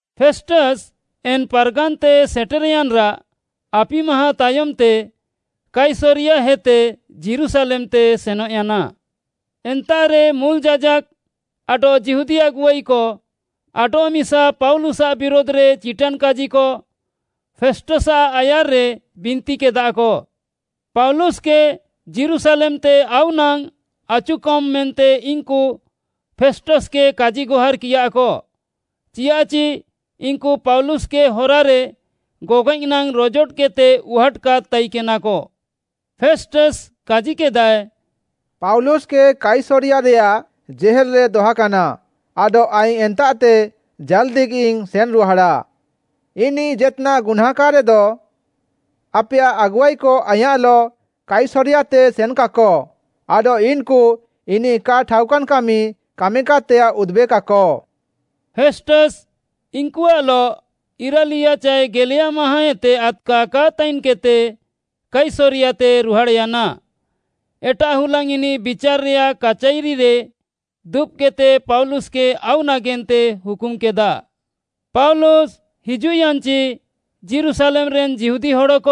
ଫେଷ୍ଟସ୍‌ ଏନ୍‌ ପାର୍‌ଗାନ୍‌ତେ ସେଟେର୍‌ୟାନ୍‌ରାଃ ଆପି ମାହାଁ ତାୟମ୍‌ତେ କାଇସରିୟାହେତେ ଯୀରୁଶାଲେମ୍‌ତେ ସେନଃୟାନା। ଏନ୍ତାଃରେ ମୁଲ୍‌ ଯାଜାକ୍‌ ଆଡଃ ଯିହୁଦୀ ଆଗୁଆଇକ ଆଡଃମିସା ପାଉଲୁସ୍‌ଆଃ ବିରୁଧ୍‌ରେ ଚିଟାନ୍‌କାଜିକ ଫେଷ୍ଟସ୍‌ଆଃ ଆୟାର୍‌ରେ ବିନ୍ତିକେଦାକ। ପାଉଲୁସ୍‌କେ ଯୀରୁଶାଲେମ୍‌ତେ ଆଉ ନାଙ୍ଗ୍‌ ଆଚୁକମ୍‌ ମେନ୍ତେ ଇନ୍‌କୁ ଫେଷ୍ଟସ୍‌କେ କାଜିଗହାର୍‌କିୟାକ, ଚିଆଃଚି ଇନ୍‌କୁ ପାଉଲୁସ୍‌କେ ହରାରେ ଗଗଏଃ ନାଙ୍ଗ୍‌ ରୋଜୋଟକେଦ୍‌ତେ ଉହାଟ୍‌କାଦ୍‌ ତାଇକେନାକ। ଫେଷ୍ଟସ୍‌ କାଜିକେଦାଏ, “ପାଉଲୁସ୍‌କେ କାଇସରିୟାରେୟାଃ ଜେହେଲ୍‌ରେ ଦହକାନା ଆଡଃ ଆଇଙ୍ଗ୍‌ ଏନ୍ତାଃତେ ଜାଲ୍‌ଦିଗିଇଙ୍ଗ୍‌ ସେନ୍‌ରୁହାଡ଼ା। ଇନିଃ ଜେତ୍‌ନାଃ ଗୁହ୍ନାଁଁକାଦ୍‌ରେଦ, ଆପେୟାଃ ଆଗୁଆଇକ ଆଇଁୟାଃଲଃ କାଇସରିୟାତେ ସେନ୍‌କାକ ଆଡଃ ଇନ୍‌କୁ ଇନିଃ କା ଠାଉକାନ୍‌କାମି କାମିକାଦ୍‌ତେୟାଃ ଉଦୁବେକାକ।” ଫେଷ୍ଟସ୍‌ ଇନ୍‌କୁଆଃଲଃ ଇରାଲିୟା ଚାଏ ଗେଲେୟା ମାହାଁଁଏତେ ଆଦ୍‌କା କା ତାଇନ୍‌କେଦ୍‌ତେ କାଇସରିୟାତେ ରୁହାଡ଼୍‌ୟାନା। ଏଟାଃ ହୁଲାଙ୍ଗ୍‌ ଇନିଃ ବିଚାର୍‌ରେୟାଃ କାଚାଇରିରେ ଦୁବ୍‌କେଦ୍‌ତେ ପାଉଲୁସ୍‌କେ ଆଉ ନାଗେନ୍ତେ ହୁକୁମ୍‌କେଦା। ପାଉଲୁସ୍‌ ହିଜୁଃୟାନ୍‌ଚି ଯୀରୁଶାଲେମ୍‌ରେନ୍‌ ଯିହୁଦୀ ହଡ଼କ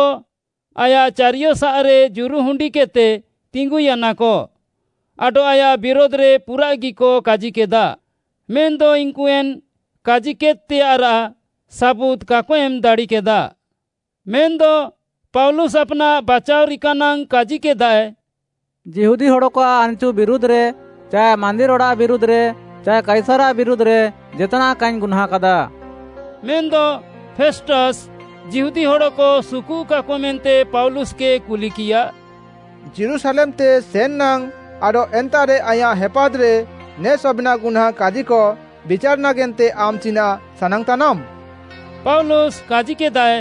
ଆୟାଃ ଚାରିୟସାଃରେ ଜୁରୁହୁଣ୍ଡିକେଦ୍‌ତେ ତିଙ୍ଗୁୟାନାକ ଆଡଃ ଆୟାଃ ବିରୁଧ୍‌ରେ ପୁରାଃଗିକ କାଜିକେଦା। ମେନ୍‌ଦ ଇନ୍‌କୁ ଏନ୍‌ କାଜିକେଦ୍‌ତେୟାଃରାଃ ସାବୁଦ୍‌ କାକ ଏମ୍‌ ଦାଡ଼ିକେଦା। ମେନ୍‌ଦ ପାଉଲୁସ୍‌ ଆପ୍‌ନାଃ ବାଚାଅଃ ରିକା ନାଙ୍ଗ୍‌ କାଜିକେଦାଏ, “ଯିହୁଦୀ ହଡ଼କଆଃ ଆନ୍‌ଚୁ ବିରୁଧ୍‌ରେ ଚାଏ ମାନ୍ଦିର୍‌ ଅଡ଼ାଃ ବିରୁଧ୍‌ରେ ଚାଏ କାଇସାର୍‌ଆଃ ବିରୁଧ୍‌ରେ ଜେତ୍‌ନାଃ କାଇଙ୍ଗ୍‌ ଗୁହ୍ନାଁଁକାଦା।” ମେନ୍‌ଦ ଫେଷ୍ଟସ୍‌ ଯିହୁଦୀ ହଡ଼କ ସୁକୁଃକାକ ମେନ୍ତେ ପାଉଲୁସ୍‌କେ କୁଲିକିୟା, “ଯୀରୁଶାଲେମ୍‌ତେ ସେନ୍‌ ନାଙ୍ଗ୍‌ ଆଡଃ ଏନ୍ତାଃରେ ଆଇଁୟାଃ ହେପାଦ୍‌ରେ ନେ ସବେନ୍‌ ଗୁହ୍ନାଁଁ କାଜିକ ବିଚାର୍‌ ନାଗେନ୍ତେ ଆମ୍‌ ଚିନାଃ ସାନାଙ୍ଗ୍‌ତାନାମ୍‌?” ପାଉଲୁସ୍‌ କାଜିକେଦାଏ,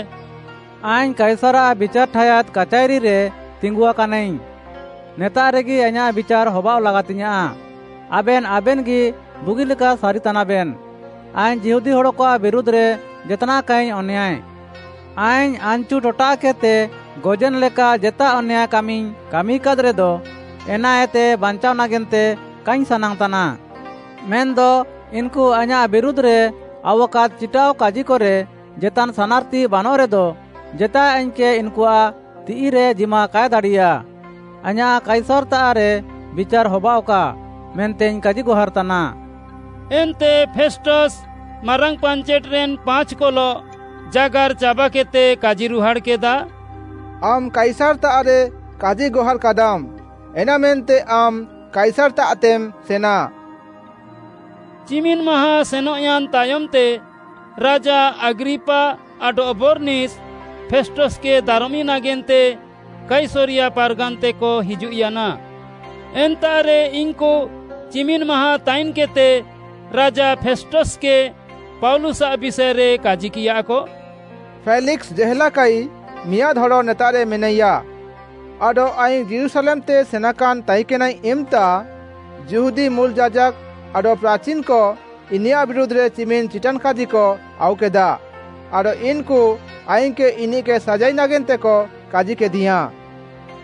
“ଆଇଙ୍ଗ୍‌ କାଇସାର୍‌ଆଃ ବିଚାର୍‌ ଠାୟାଦ୍‌ କାଚାଇରିରେ ତିଙ୍ଗୁଆକାନାଇଙ୍ଗ୍‌। ନେତାଃରେଗି ଆଇଁୟାଃ ବିଚାର୍‌ ହବାଅଃ ଲାଗାତିଙ୍ଗ୍‌ୟାଁଃ। ଆବେନ୍‌ ଆବେନ୍‌ଗି ବୁଗିଲେକା ସାରିତାନାବେନ୍‌, ଆଇଙ୍ଗ୍‌ ଯିହୁଦୀ ହଡ଼କଆଃ ବିରୁଧ୍‌ରେ ଜେତ୍‌ନାଃ କାଇଙ୍ଗ୍‌ ଅନ୍ୟାୟ। ଆଇଙ୍ଗ୍‌ ଆନ୍‌ଚୁ ଟଟାଃକେଦ୍‌ତେ ଗଜେନ୍‌ ଲେକା ଜେତା ଅନ୍ୟାୟ କାମିଇଙ୍ଗ୍‌ କାମିକାଦ୍‌ରେଦ, ଏନାଏତେ ବାଞ୍ଚାଅଃ ନାଗେନ୍ତେ କାଇଙ୍ଗ୍‌ ସାନାଙ୍ଗ୍‌ତାନା। ମେନ୍‌ଦ ଇନ୍‌କୁ ଆଇଁୟାଃ ବିରୁଧ୍‌ରେ ଆଉୱାକାଦ୍‌ ଚିଟାଅଃକାଜିକରେ ଜେତାନ୍‌ ସାନାର୍‌ତି ବାନଃରେଦ, ଜେତାଏ ଆଇଙ୍ଗ୍‌କେ ଇନ୍‌କୁଆଃ ତିଃଇରେ ଜିମା କାଏ ଦାଡ଼ିୟା। ଆଇଁୟାଃ କାଇସାର୍‌ତାଃରେ ବିଚାର୍‌ ହବାଅଃକା ମେନ୍ତେଇଙ୍ଗ୍‌ କାଜିଗହାର୍‌ତାନାଃ।” ଏନ୍ତେ ଫେଷ୍ଟସ୍‌, ମାରାଙ୍ଗ୍‌ ପାଞ୍ଚେଟ୍‌ରେନ୍‌ ପାଞ୍ଚ୍‌କଲଃ ଜାଗାର୍‌ ଚାବାକେଦ୍‌ତେ କାଜିରୁହାଡ଼୍‌କେଦା, “ଆମ୍‌ କାଇସାର୍‌ତାଃରେ କାଜିଗହାର୍‌କାଦାମ୍‌, ଏନାମେନ୍ତେ ଆମ୍‌ କାଇସାର୍‌ତାଃତେମ୍‌ ସେନା।” ଚିମିନ୍‍ ମାହାଁ ସେନଃୟାନ୍‌ ତାୟମ୍‌ତେ ରାଜା ଆଗ୍ରିପା ଆଡଃ ବର୍‌ନିସ୍‌, ଫେଷ୍ଟସ୍‌କେ ଦାରମି ନାଗେନ୍ତେ କାଇସରିୟା ପାର୍‌ଗାନ୍‌ତେକ ହିଜୁଃୟାନା। ଏନ୍ତାଃରେ ଇନ୍‌କୁ ଚିମିନ୍‌ ମାହାଁ ତାଇନ୍‌କେଦ୍‌ତେ ରାଜା ଫେଷ୍ଟସ୍‌କେ ପାଉଲୁସ୍‌ଆଃ ବିଷାଏରେ କାଜିକିୟାକ, “ଫେଲିକ୍‌ସ୍‌ ଜେହେଲାକାଇ ମିଆଁଦ୍‌ ହଡ଼ ନେତାଃରେ ମିନାଇୟା। ଆଡଃ ଆଇଙ୍ଗ୍‌ ଯୀରୁଶାଲେମ୍‌ତେ ସେନାକାନ୍‌ ତାଇକେନାଇଙ୍ଗ୍‌ ଇମ୍‌ତା, ଯିହୁଦୀ ମୁଲ୍‌ ଯାଜାକ୍‌ ଆଡଃ ପ୍ରାଚିନ୍‌କ ଇନିୟାଃ ବିରୁଧ୍‌ରେ ଚିମିନ୍‌ ଚିଟାନ୍‌କାଜିକ ଆଉକେଦା ଆଡଃ ଇନ୍‌କୁ ଆଇଙ୍ଗ୍‌କେ ଇନିଃକେ ସାଜାଇ ନାଗେନ୍ତେକ କାଜିକେଦିୟାଁ।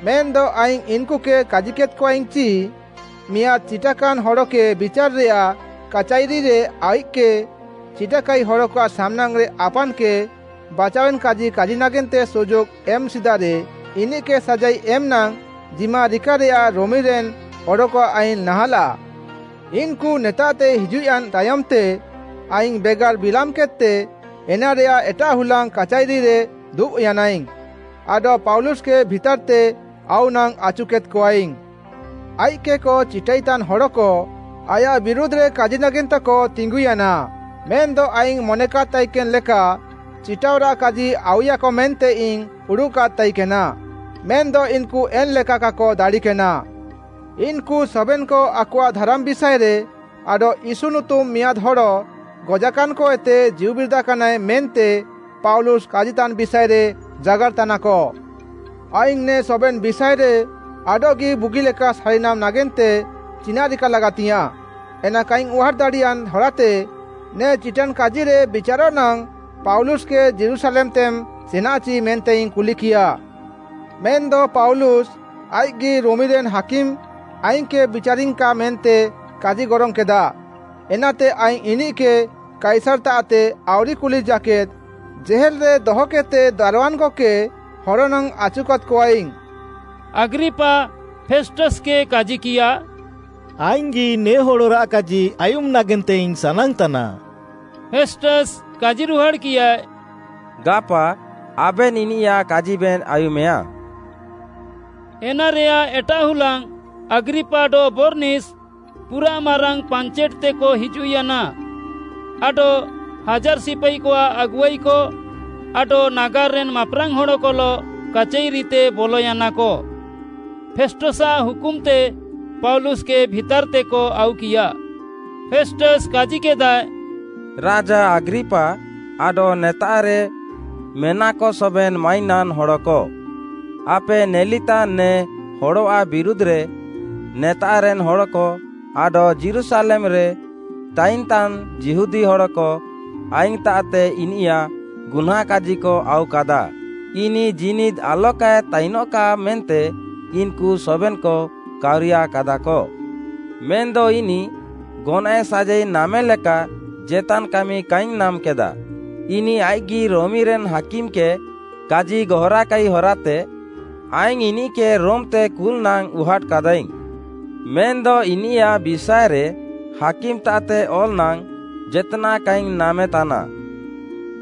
ମେନ୍‌ଦ ଆଇଙ୍ଗ୍‌ ଇନ୍‌କୁକେ କାଜିକେଦ୍‌କଆଇଙ୍ଗ୍‌ ଚି, ମିଆଁଦ୍‌ ଚିଟାକାନ୍‌ ହଡ଼କେ ବିଚାର୍‌ରେୟାଃ କାଚାଇରିରେ ଆଇଃକ୍‌କେ ଚିଟାକାଇ ହଡ଼କଆଃ ସାମ୍‌ନାଙ୍ଗ୍‌ରେ ଆପାନ୍‌କେ ବାଚାୱେନ୍‌କାଜି କାଜି ନାଗେନ୍ତେ ସୁଯୋଗ୍‌ ଏମ୍‌ ସିଦାରେ ଇନିଃକେ ସାଜାଇ ଏମ୍‌ ନାଙ୍ଗ୍‌ ଜିମା ରିକାରେୟାଃ ରୋମିରେନ୍‌ ହଡ଼କଆଃ ଆଇନ୍‌ ନାହାଁଲାଃ। ଇନ୍‌କୁ ନେତାଃତେ ହିଜୁଃୟାନ୍‌ ତାୟମ୍‌ତେ ଆଇଙ୍ଗ୍‌ ବେଗାର୍‌ ବିଲାମ୍‌କେଦ୍‌ତେ ଏନାରେୟାଃ ଏଟାଃ ହୁଲାଙ୍ଗ୍‌ କାଚାଇରିରେ ଦୁବ୍‌ୟାନାଇଙ୍ଗ୍‌ ଆଡଃ ପାଉଲୁସ୍‌କେ ଭିତାର୍‌ତେ ଆଉ ନାଙ୍ଗ୍‌ ଆଚୁକେଦ୍‌କଆଇଙ୍ଗ୍‌। ଆଇଃକ୍‌କେ ଚିଟାଇତାନ୍‌ ହଡ଼କ ଆୟାଃ ବିରୁଧ୍‌ରେ କାଜି ନାଗେନ୍ତେକ ତିଙ୍ଗୁୟାନା, ମେନ୍‌ଦ ଆଇଙ୍ଗ୍‌ ମନେକାଦ୍‌ ତାଇକେନ୍‌ ଲେକା ଚିଟାଅଃରାଃ କାଜି ଆଉୟାକ ମେନ୍ତେଇଙ୍ଗ୍‌ ଉଡ଼ୁଃକାଦ୍‌ ତାଇକେନା, ମେନ୍‌ଦ ଇନ୍‌କୁ ଏନ୍‌ ଲେକା କାକ ଦାଡ଼ିକେନା। ଇନ୍‌କୁ ସବେନ୍‌କ ଆକଆଃ ଧାରାମ୍‌ ବିଷାଏରେ ଆଡଃ ୟୀଶୁ ନୁତୁମ୍‌ ମିଆଁଦ୍‌ ହଡ଼, ଗଜାକାନ୍‌କଏତେ ଜୀଉବିରିଦାକାନାଏ ମେନ୍ତେ ପାଉଲୁସ୍‌ କାଜିତାନ୍‌ ବିଷାଏରେ ଜାଗାର୍‌ତାନାକ। ଆଇଙ୍ଗ୍‌ ନେ ସବେନ୍‌ ବିଷାଏରେ ଆଡଃଗି ବୁଗିଲେକା ସାରିନାମ୍‌ ନାଗେନ୍ତେ ଚିନାଃ ରିକା ଲାଗାତିୟାଁ, ଏନା କାଇଙ୍ଗ୍‌ ଉହାଟ୍‌ ଦାଡ଼ିୟାନ୍‌ ହରାତେ, ନେ ଚିଟାନ୍‌କାଜିରେ ବିଚାରଃ ନାଙ୍ଗ୍‌ ପାଉଲୁସ୍‌କେ ଯୀରୁଶାଲେମ୍‌ତେମ୍‌ ସେନାଚି ମେନ୍ତେଇଙ୍ଗ୍‌ କୁଲିକିୟା। ମେନ୍‌ଦ ପାଉଲୁସ୍‌, ଆଇଃକ୍‌ଗି ରୋମିରେନ୍‌ ହାକିମ୍‌ ଆଇଙ୍ଗ୍‌କେ ବିଚାରିଙ୍ଗ୍‌କା ମେନ୍ତେ କାଜିଗରଙ୍ଗ୍‌କେଦା, ଏନାତେ ଆଇଙ୍ଗ୍‌ ଇନିଃକେ କାଇସାର୍‌ତାଃତେ ଆଉରି କୁଲି ଜାକେଦ୍‌ ଜେହେଲ୍‌ରେ ଦହକେଦ୍‌ତେ ଦାର୍‌ୱାନ୍‌କକେ ହର ନାଙ୍ଗ୍‌ ଆଚୁକାଦ୍‌କଆଇଙ୍ଗ୍‌।” ଆଗ୍ରିପା ଫେଷ୍ଟସ୍‌କେ କାଜିକିୟା, “ଆଇଙ୍ଗ୍‌ଗି ନେ ହଡ଼ରାଃ କାଜି ଆୟୁମ୍‌ ନାଗେନ୍ତେଇଙ୍ଗ୍‌ ସାନାଙ୍ଗ୍‌ତାନା।” ଫେଷ୍ଟସ୍‌ କାଜିରୁହାଡ଼୍‌କିୟାଏ, “ଗାପା ଆବେନ୍‌ ଇନିୟାଃ କାଜିବେନ୍‌ ଆୟୁମେୟା।” ଏନାରେୟାଃ ଏଟାଃ ହୁଲାଙ୍ଗ୍‌ ଆଗ୍ରିପା ଆଡଃ ବର୍‌ନିସ୍‌ ପୁରାଃ ମାରାଙ୍ଗ୍‌ ପାଞ୍ଚେଟ୍‌ତେକ ହିଜୁଃୟାନା ଆଡଃ ହାଜାର୍‌ ସିପାଇକଆଃ ଆଗୁଆଇକ ଆଡଃ ନାଗାର୍‌ରେନ୍‌ ମାପ୍‌ରାଙ୍ଗ୍‌ ହଡ଼କଲଃ କାଚାଇରିତେ ବଲୟାନାକ। ଫେଷ୍ଟସ୍‌ଆଃ ହୁକୁମ୍‌ତେ ପାଉଲୁସ୍‌କେ ଭିତାର୍‌ତେକ ଆଉକିୟା। ଫେଷ୍ଟସ୍‌ କାଜିକେଦାଏ, “ରାଜା ଆଗ୍ରିପା ଆଡଃ ନେତାଃରେ ମେନାକ ସବେନ୍‌ ମାଇନାନ୍‌ ହଡ଼କ, ଆପେ ନେଲିତାନ୍‌ ନେ ହଡ଼ଆଃ ବିରୁଧ୍‌ରେ ନେତାଃରେନ୍‌ ହଡ଼କ ଆଡଃ ଯୀରୁଶାଲେମ୍‌ରେ ତାଇନ୍‌ତାନ୍‌ ଯିହୁଦୀ ହଡ଼କ ଆଇଙ୍ଗ୍‌ତାଃତେ ଇନିୟାଃ ଗୁହ୍ନାଁଁକାଜିକ ଆଉୱାକାଦା। ଇନିଃ ଜୀନିଦ୍‌ ଆଲକାଏ ତାଇନଃକା ମେନ୍ତେ ଇନ୍‌କୁ ସବେନ୍‌କ କାଉରିୟାକାଦାକ। ମେନ୍‌ଦ ଇନିଃ ଗନଏଃ ସାଜାଇ ନାମେଲେକା ଜେତାନ୍‌ କାମି କାଇଙ୍ଗ୍‌ ନାମ୍‌କେଦା। ଇନିଃ ଆଇଃକ୍‌ଗି ରୋମିରେନ୍‌ ହାକିମ୍‌କେ କାଜିଗହାର୍‌କାଇ ହରାତେ, ଆଇଙ୍ଗ୍‌ ଇନିଃକେ ରୋମ୍‌ତେ କୁଲ୍‌ ନାଙ୍ଗ୍‌ ଉହାଟ୍‌କାଦାଇଙ୍ଗ୍‌। ମେନ୍‌ଦ ଇନିୟାଃ ବିଷାଏରେ ହାକିମ୍‌ତାଃତେ ଅଲ୍‌ ନାଙ୍ଗ୍‌ ଜେତ୍‌ନାଃ କାଇଙ୍ଗ୍‌ ନାମେତାନା।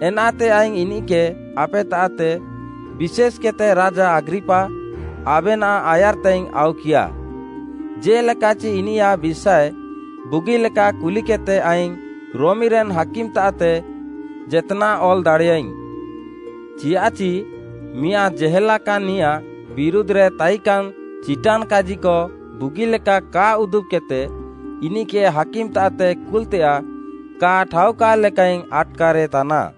ଏନାତେ ଆଇଙ୍ଗ୍‌ ଇନିଃକେ ଆପେତାଃତେ, ବିଶେଷ୍‌କେଦ୍‌ତେ ରାଜା ଆଗ୍ରିପା, ଆବେନାଃ ଆୟାର୍‌ତେଇଙ୍ଗ୍‌ ଆଉକିୟା, ଜେ'ଲେକାଚି ଇନିୟାଃ ବିଷାଏ ବୁଗିଲେକା କୁଲିକେଦ୍‌ତେ ଆଇଙ୍ଗ୍‌ ରୋମିରେନ୍‌ ହାକିମ୍‌ତାଃତେ ଜେତ୍‌ନାଃଇଙ୍ଗ୍‌ ଅଲ୍‌ ଦାଡ଼ିୟା। ଚିଆଃଚି ମିଆଁଦ୍‌ ଜେହେଲାକାନ୍‍ନିୟାଃ ବିରୁଧ୍‌ରେ ତାଇକାନ୍‌ ଚିଟାନ୍‌କାଜିକ ବୁଗିଲେକା କା ଉଦୁବ୍‌କେଦ୍‌ତେ ଇନିଃକେ ହାକିମ୍‌ତାଃତେ କୁଲ୍‌ତେୟାଃ କା ଠାଉକା ଲେକାଇଙ୍ଗ୍‌ ଆଟ୍‌କାରେତାନା।”